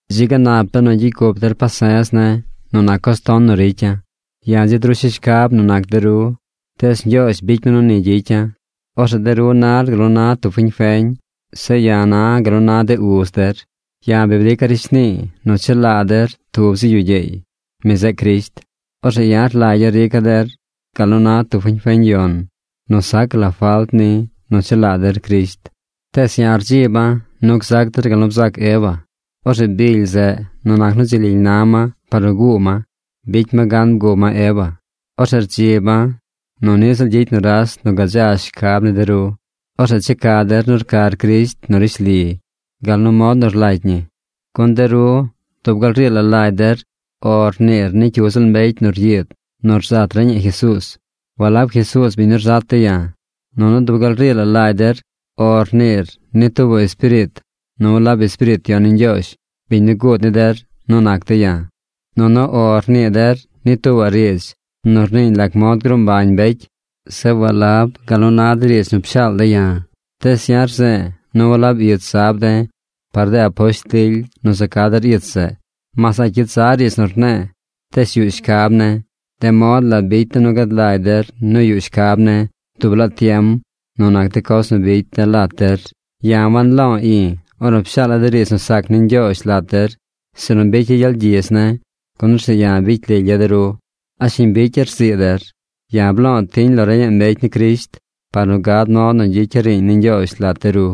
¡Dzi ga nap benu gyicy cup der pase̱z ne̱ nu nac coz ton nu ricya̱! Ya̱ dzi drusha̱ shcab nu nac de ru. Tees Ñgyoozh bicy mi nu ni gyicya̱. Orzeꞌ de ru nar gal nu na tub fiñ feñ. Zeꞌ ya̱ na̱ gal nu na de uz der. Ya̱ bi brica̱ rishnii nu chelaa der tub zi yu gyeey. Mi zeꞌ Crisht. Orzeꞌ ya̱ rlagya̱ rica̱ der gal nu na tub fiñ feñ yon nu sac la falt ni nu chelaa der Crisht. Tees ya̱ rdziba̱ nu gzac der gal nu bzac Eva. Orzeꞌ bily zeꞌ, nu nac nu dzi lily na ma par nu guu ma, bicy ma gan bguu ma Eva. Orzeꞌ rdziba̱ nu niꞌ ziꞌl gyicy nuras nu gadza shcab ni de ru. Orzeꞌ checa der nu rcar Crisht nu rishli gal nu mod nu rlagy ñi. Gun de ru dub gal rii la lagy der “O” rniir ni cyu ziꞌl mbecy nu ryiid nu rzat reñaꞌ Jesuuz, walab Jesuuz biñ nu rzat de̱ ya̱. Nunu dub gal rii la lagy der “O” rniir ni tuubaꞌ espiriit nu walab Espiriit Yon ni Ñgyoozh biñ nu guud ni der nu nac de̱ ya̱. Nunu “O” rnii der ni tuubaꞌ riidz nu rniiñ lac mod gruu mbañ mbecy zeꞌ walab gal nu na de riidz nu pshaal de̱ ya̱. Tees ya̱ rze̱e̱ nu walab ich zab de̱ par de aposht lily nu za ca der ich zeꞌ. Mas a̱ꞌ cyit za riidz nu rne̱e̱, tees yuꞌ shcab ne̱. De mod la bicy de̱ nu gad lagy der nu yuꞌ shcab ne̱ dub laa tiem nu nac de coz nu bicy de̱ lat der. Ya̱ wanlo̱o̱ i̱ ornu pshaala̱ de riidz nu sac ni Ñgyoozh lat der, sinu bicya̱ gyel gyidz ne̱, gun orzeꞌ ya̱ bicy lilya̱ de ru. ¿A shiñ bicya̱ rzii der? Ya̱ blo̱o̱ tiñ lo reñaꞌ mbecy ni Crisht par nu gad mod nu gyicya̱ riiñ ni Ñgyoozh lat de ru.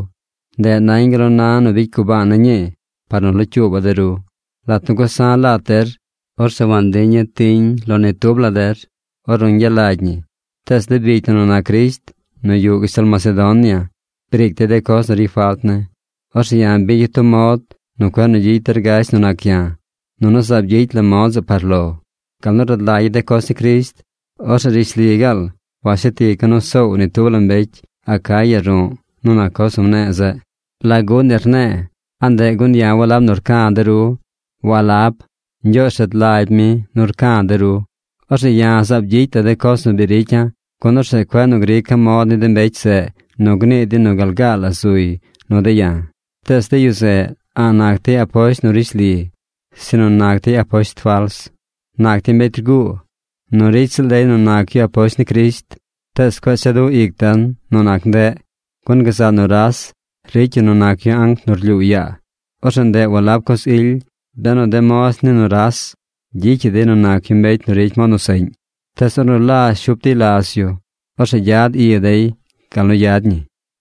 Ndeꞌ nañ gal nu na nu bicy gubaana̱ ñii par nu locyuuba̱ de ru. Lat nu gusa̱ lat der, orzeꞌ wantiña̱ tiñ lo ni tub la der ornu ñgyalagy ñi. Tees de bicy na nu nac Crisht nu yuꞌ gashtal Macedonia briic dey de coz nu ricy falt ne̱. Orzeꞌ ya̱ bicya̱ tub mod nu cueꞌ nu gyicy der gasht nu nac ya̱. Nunu zaab gyicy la̱ mod zeꞌ par lo. Gal nu rad lagya̱ de coz ni Crisht, orzeꞌ rishli gaal washet ica̱ nu soow ni tub la mbecy Acaya ru̱ꞌ nu nac coz nu mne̱e̱ zeꞌ. ¿Lagu ni rne̱e̱? ¿A ndeꞌ gun ya̱ walab nu rca̱ de ru? ¡Walab! Ñgyoozh rad lagy mi nu rca̱ de ru. Orzeꞌ ya̱ zaab gyicy la̱ de coz nu bi ricya̱, gun orzeꞌ cueꞌ nu grica̱ mod ni de mbecy zeꞌ nu gnii dey nu gal gaa la zuy nu de̱ ya̱. Tees de yu zeꞌ a̱ꞌ nac dey aposht nu rishli, sinu nac dey aposht fals. Nac dey mbecy rguu. Nu ricy ziꞌl dey nu nac yu aposht ni Crisht. Tees cueꞌ cha du ic den nu nac ndeꞌ, gun gazaꞌ nuras ricy yu nu nac yu anc nu rlyuu yaa. Orzeꞌ ndeꞌ walab la coz ily, benu de moz ni nuras gyicyaꞌ dey nu nac yu mbecy nu ricy mod nu seꞌñ. ¡Tees ornu lazh shup dey laz yu, orzeꞌ gyad i dey gal nu yad ñi!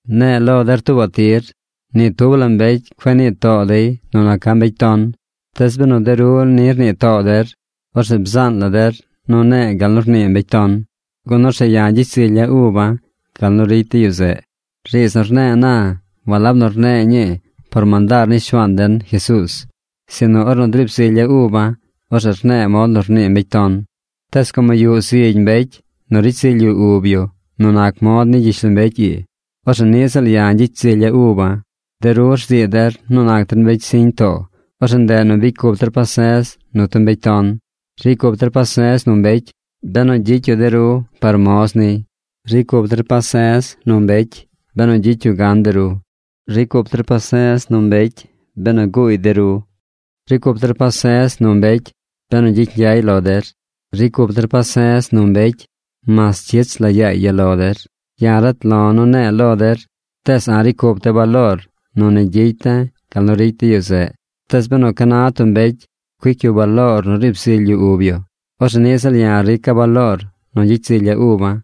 Ne̱e̱ lo der tuubaꞌ tir: ni tub la mbecy cueꞌ nii too dey nu naca̱ mbecy ton. Tees benu de ru ni rnii too der, orzeꞌ bzaan la der nu ne̱e̱ gal nu rnii mbecy ton, gun orzeꞌ ya̱ gyicy zilya̱ uba̱ gal nu ricy de yu zeꞌ. Riidz nu rne̱e̱ na, walab nu rne̱e̱ ñii por mandaar ni Shuaan den, Jesuuz, sinu ornu driib zilya̱ uba̱, orzeꞌ rne̱e̱ mod nu rnii mbecy ton. Tees como yuꞌ zigy mbecy nu ricy zily yu ub yu nu nac mod ni mbecy gyishlombecy ii, orzeꞌ niꞌ ziꞌl ya̱ gyicy zilya̱ uba̱. De ru rzii der nu nac der mbecy siñ too, orzeꞌ ndeꞌ nu bicy cup der pase̱z nu tub mbecy ton. Ricy cup der pase̱z nu mbecy, benu gyicy yu de ru par moz niy. Ricy cup der pase̱z nu mbecy, benu gyicy yu gan de ru. Ricy cup der pase̱z nu mbecy benu guuy de ru. Ricy cup der pase̱z nu mbecy benu gyicy ñgyay lo der. Ricy cup der pase̱z nu mbecy mas cyich la yaay ya lo der. Ya̱ rat lo̱ nu ne̱e̱ lo der, ¡tees a̱ꞌ ricy cup de̱ baloor nu ni gyicy de̱ gal nu ricy de yu zeꞌ! Tees benu ca na tub mbecy cuic yu baloor nu riib zily yu ub yu, orzeꞌ niꞌ ziꞌl ya̱ rica̱ baloor nu gyicy zilya̱ uba̱,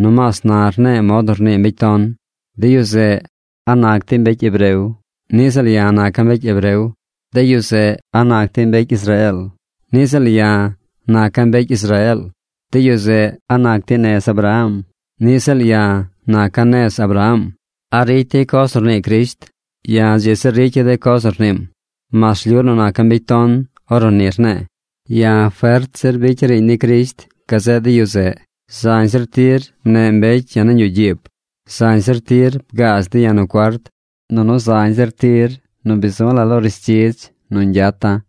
nomaas na rne̱e̱ mod nu rnii mbecy ton. De yu zeꞌ, ¿a nac dey mbecy hebreo? Niꞌ ziꞌl ya̱ naca̱ mbecy hebreo. De yu zeꞌ, ¿a nac dey mbecy Israeel? Niꞌ ziꞌl ya̱ naca̱ mbecy Israeel. De yu zeꞌ, ¿a nac dey nez Abraham? Niꞌ ziꞌl ya̱ naca̱ nez Abraham. ¿A ricy dey coz nu rnii Crisht? Ya̱ dzi zir ricya̱ de coz nu rniim, mas rlyu nu naca̱ mbecy ton ornu ni rne̱e̱. Ya̱ fert zir bicya̱ riiñ ni Crisht gazeꞌ de yu zeꞌ. Zañ zir tir mneꞌ mbecy ya̱ nañ yuꞌ gyiib. Zañ zir tir bgaaz dey ya̱ nu cuart. Nunu zañ zir tir nu bi zu la̱ lo rishdzidz nu ñgyata̱.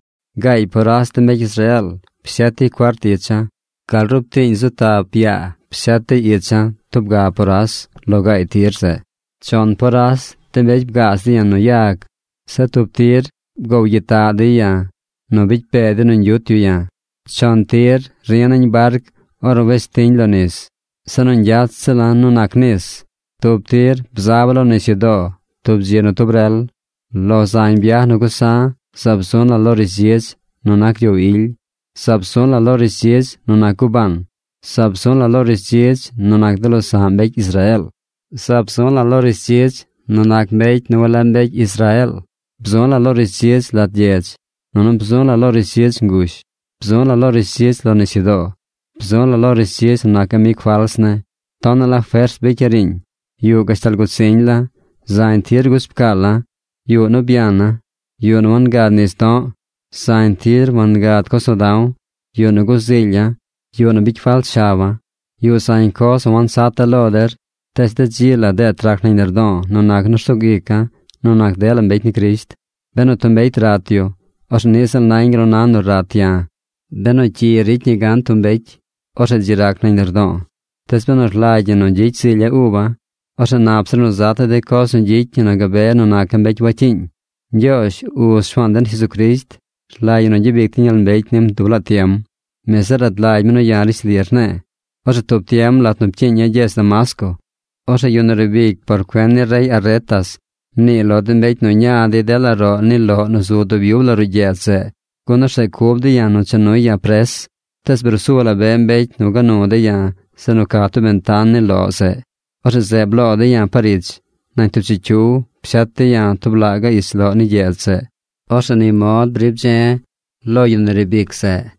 Gaay poras de mbecy Israeel pshet dey cuart icha̱. Gal rub tiiñ zu tap yaa pshet dey icha̱ tub ga poras lo gaay tir zeꞌ. Chon poras de mbecy bgaaz dey ya̱ nu yag. Zeꞌ tub tir bgoow gyitaꞌ dey ya̱ nu bicy pee dey nu ñgyut yu ya̱. Chon tir ri̱ nañ barc ornu wes tiñ lo nis. Se nu ñgyat ziꞌla̱ nu nac nis. Tub tir bzaba̱ lo nisyudoo tub dzi nu tub rel. Lo zañ byaj nu gusa̱ zaab zu̱ la̱ lo rishdzidz nu nac gyoow ily. Zaab zu̱ la̱ lo rishdzidz nu nac gubaan. Zaab zu̱ la̱ lo rishdzidz nu nac de losa̱ꞌ mbecy Israeel. Zaab zu̱ la̱ lo rishdzidz nu nac mbecy nu walab mbecy Israeel. Bzu̱ la̱ lo rishdzidz lat gyedz. Nunu bzu̱ la̱ lo rishdzidz ngush. Bzu lo lo rishdzidz lo nisyudoo. Bzu̱ la̱ lo rishdzidz nu nac amig fals ne̱. Tonaꞌ la fers bicya̱ riiñ. Yuꞌ gashtal gut ziñ la̱. Zañ tir guch pcaala̱. Yuꞌ nu byana̱. Yuꞌ nu wangad nis do̱ꞌ. Zañ tir wangad coz nu da̱w. Yuꞌ nu guzilya̱. Yuꞌ nu bicy falt shaba̱. Yuꞌ zañ coz nu wansata̱ lo der. Tees de dzi la deet rac nañ lardo̱o̱ nu nac nu rsug ica̱ nu nac dela mbecy ni Crisht. Benu tub mbecy rat yu, orzeꞌ niꞌ ziꞌl nañ gal nu na nu rat ya̱. Benu cyi gyicy ni gan tub mbecy, orzeꞌ dzi rac nañ lardo̱o̱. Tees benu rlagy ñi nu gyicy zilya̱ uba̱, orzeꞌ nap zir nu zata̱ de coz nu gyicy ñi nu gabe nu naca̱ mbecy wacyiiñ. Ñgyoozh, Uz Shuaan den Jesucrisht, rlagy ñi nu gyabic den gyel mbecy nim dub laa tiem. Mi zeꞌ rad lagy mi nu ya̱ rishli rne̱e̱. Orzeꞌ tub tiem lat nu pcyiiña̱ gyedz Damasco, orzeꞌ yu nu riib ic por cuen ni rey Aretas mniiy lo de mbecy nu ña dey dela roꞌ ni loꞌ nu zu dub yub la ruꞌ gyedz zeꞌ, gun orzeꞌ cub dey ya̱ nu cha nuy ya̱ pres. Tees bruu su la be mbecy gua nu dey ya̱ zeꞌ nu ca tub bentan ni loꞌ zeꞌ. Orzeꞌ zeꞌ bloo dey ya̱ par ich. Nañ tub chicyiw pshet dey ya̱ tub laꞌ gaꞌ ich loꞌ ni gyedz zeꞌ. Orzeꞌ ni mod briib dze̱ lo yu nu riib ic zeꞌ.